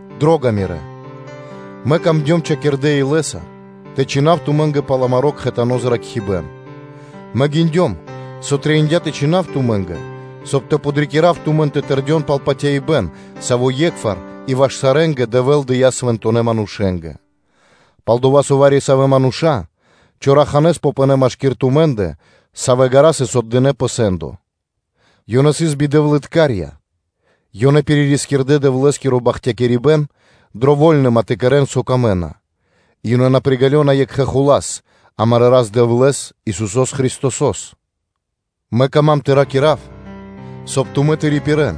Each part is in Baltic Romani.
Дро́га мирэ́! Мэ камдём хачкирдэ́ илэ́са тэ чхинав тумэ́нгэ пал амаро́ кхэтано зракхибэ́н, мэ гиндём, со трэиндя́ тэ чхинав тумэ́нгэ, соб (кай) тэ подрикирав тумэн тэ тэрдён пал патяибэ́н, саво́ е́кхвар и ваш сарэ́нгэ Дэвэ́л дыя́ свэнтонэ́ манушэ́нгэ. Пал-дова́ со вари-савэ́ мануша́ чораханэ́с попынэ машки́р тумэ́ндэ, савэ́ ґара́ сыс отдынэ́ пэ сэ́ндо. Ёнэ исын бидэвлыткарья, ёнэ пиририскирдэ Дэвлэ́скиро бахтякирибэ́н дро вольныма тэ кэрэ́н, со камэ́на, и ёнэ на приґалёна Екхэ Рас-Барэс, амарэ́ Рас-Дэвлэ́с, Исусо́с Христосо́с. Мэ кама́м тэ ракира́в, соб (кай) тумэ́ тэ рипирэ́н,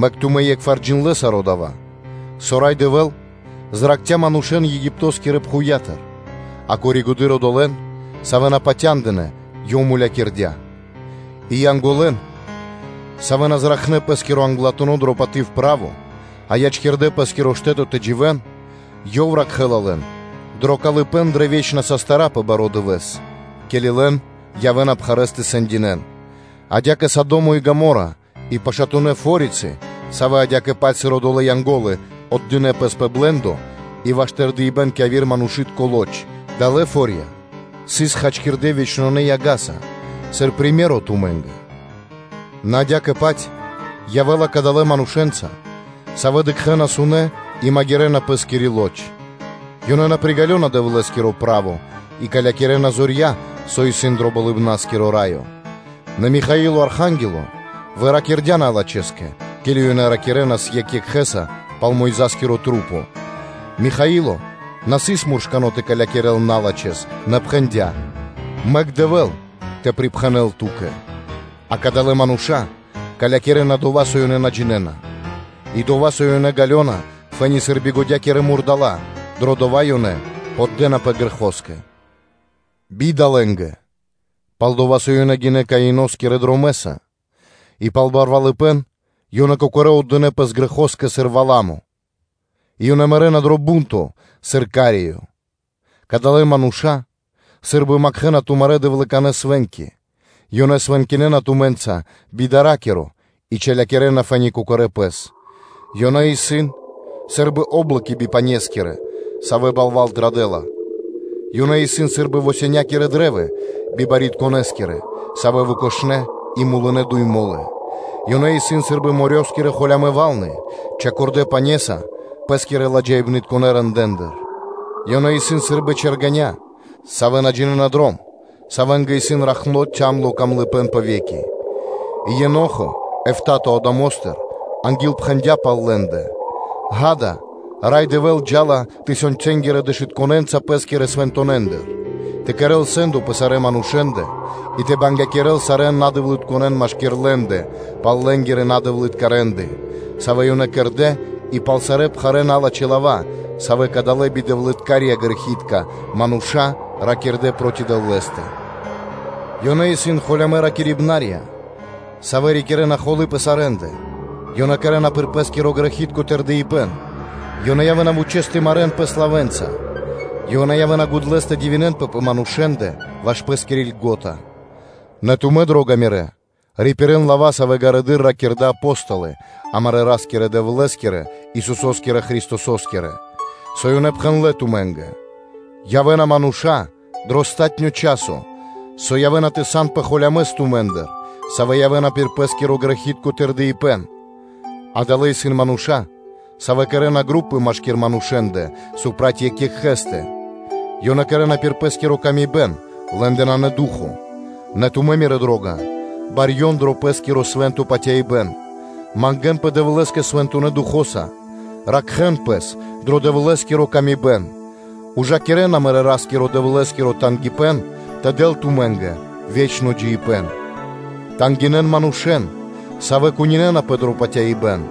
мэк тумэ́ е́кхвар джиндлэ́ саро́ дава́, со Рай Дэвэ́л зракхця́ манушэ́н Египто́скирэ пхувья́тыр, а коригэды́р (позжэ) одолэ́н, савэ́ на патяндынэ́, Ёв мулякирдя́. И Янголэн, савэ́ на зракхнэ́ пэ́скиро англатуно́ право дрэ паты́в, а ячкирдэ́ пэ́скиро штэ́то тэ дживэ́н, Ёв ракхэ́ла лэн дро калыпэ́н дрэ вечна састыра́ пэ баро́ Дывэ́с, ке́ли лэн явэ́ла Ёв пхарэ́с тэ сэндякирэ́л; адя́кэ сыр Содо́мо и Гомо́ра и пашатунэ́ форицы, савэ́ адя́кэ-паць, сыр одолэ́ Янго́лы отдынэ́ пэс пэ блэ́ндо и ваш тырдыпэ́н кэ яви́р манушы́тко лоч: далэ́ фо́рья сыс схачкирдэ́ вечнонэ яга́са сыр приме́ро (сыкаибэ́н) тумэ́нгэ. Нэ адя́кэ-паць явэ́ла кадалэ́ манушэ́нца, савэ́ дыкхэ́на сунэ́ и магирэна пэ́скири лоч; ёнэ на приґалёна Дэвлэ́скиро право и калякирэна зорья, со исын дро Болыбна́скиро Раё. Нэ Михаило Архангело выракирдя налачхэскэ, ке́ли ёнэ ракирэ́нас екх екхэ́са пал Мойза́скирэ маса́, Михаило на сыс муршкано́ тэ калякирэл налачхэ́с, нэ пхэндя́: “Мэк Дэвэ́л тэ припхэнэл Ту́кэ.” А кадалэ́ мануша́ калякирэна дова́, со ёнэ на джинэ́на, и дова́, со ёнэ ґалёна фэ́ни сыр билавэнгирэ мурдала́; дро дова́ ёнэ поддэнапэ грэхоскэ. Бида лэ́нгэ! Пал-дова́ со ёнэ гинэ́ Каиноскирэ дромэ́са и пал барвалыпэ́н ёнэ кокорэ́ отдынэ́ пэс грэхоскэ, сыр Валамо и ёнэ мэрэ́на дро бу́нто, сыр Кареё. Кадалэ́ мануша́ сы́рбы макхэна тумарэ́ дэвлыканэ свэ́нки: ёнэ свэнкинэна тумэ́нца би дара́киро и чалякирэна фэ́ни кокорэ́ пэс. Ёнэ исын сы́рбы о́блоки бипанескирэ, савэ́ балва́л традэ́ла. Ёнэ исын сы́рбы восенякирэ кашта́ бибарьякирдэскирэ, савэ́н выкошнэ и, савэ́ мулынэ дуй мо́лы; ёнэ исын сы́рбы морёскирэ (дэрьявэ́скирэ) холямэ́ валны (вэлны), учхакирдэ пенаса пэ́скирэ ладжаипнытконэ рэндэ́ндыр (делэндыр); ёнэ исын сы́рбы чэргэня́, савэ́ на джинэ́на дром, савэ́нгэ исын ракхно калыпэ́н (цямлыпэ́н) пэ ве́ки. И Енохо, эфта́то Адамостыр, ангилпхэндя пал лэ́ндэ: ґа́да, Рай Дэвэ́л джа́ла тысёнцэнгирэ дэшытконэнца Пэ́скирэ свэнтонэндыр, тэ кэрэ́л сэ́ндо пэ сарэ́ манушэ́ндэ и тэ бангякирэл сарэ́н надэвлытконэн машки́р лэ́ндэ пал лэ́нгирэ надэвлытка рэ́нды, савэ́ ёнэ кэрдэ́ и пал сарэ́ пхарэ́ налачхэ́ лава́, савэ́ кадалэ́ бидэвлыткарья-грэхи́тка мануша́ ракирдэ́ проти Дэвлэ́стэ. Ёнэ исын холямэ́ ракирибнарья, савэ́ рикирэ́на холы́ пэ сарэ́ндэ, ёнэ кэрэ́на пир пэ́скиро грэхи́тко тырдыпэ́н; ёнэ явэ́на вучэ́с тэ марэ́н пэс лавэ́нца, ёнэ явэ́на гудлэс тэ дивинэнпэ пэ манушэ́ндэ ваш пэ́скири льго́та. Нэ тумэ́, дро́га мирэ́, рипирэ́н лава́, савэ́ ґарэдыр ракирдэ́ Апо́столы амарэ́ Ра́скирэ – Дэвлэ́скирэ, Исусо́скирэ Христосо́скирэ, со ёнэ пхэндлэ́ тумэ́нгэ: “Явэ́на мануша́ дро палатуно́ часо, со явэ́на тэ санпэ холямэс тумэ́ндыр, савэ́ явэ́на пир пэ́скиро грэхи́тко тырдыпэ́н.” Адалэ́ исын мануша́, савэ́ кэрэ́на групы машки́р манушэ́ндэ проти екх екхэ́стэ, ёнэ кэрэ́на пир пэ́скири годы́, лэ́ндэ нанэ Ду́хо (Фа́но). Нэ тумэ́, мирэ́ дро́га, барьён дро пэ́скиро свэ́нто патяибэ́н, мангэ́нпэ Дэвлэ́скэ Свэнтонэ́ Духо́са, ракхэ́н пэс дро Дэвлэ́скири ла́ска, ужакирэн амарэ́ Ра́скиро – Дэвлэ́скиро тангипэ́н тэ дэл тумэ́нгэ ве́чно джиибэ́н. Тангинэн манушэ́н, савэ́ кунинэнапэ дро патяибэ́н,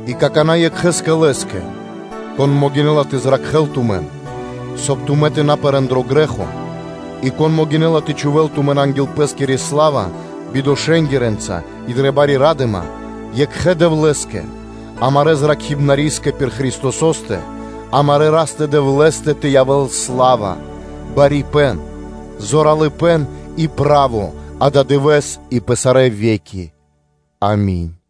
И какана́ Екхэ́скэ, Лэ́скэ, Кон могинэ́ла тэ зракхэ́л тумэн, соб (кай) тумэ́ тэ на пэрэ́н дро грэ́хо, и кон могинэ́ла тэ чхувэ́л тумэн анги́л Пэ́скири сла́ва бидошэнгирэнца и дрэ бари ра́дыма, Екхэ́скэ Дэвлэ́скэ, амарэ́ Зракхибнарискэ пир Христосо́стэ, амарэ́ Ра́скэ-Дэвлэ́скэ тэ явэ́л сла́ва, барипэ́н, зоралыпэ́н и право ададывэ́с и пэ сарэ́ ве́ки. Ами́нь.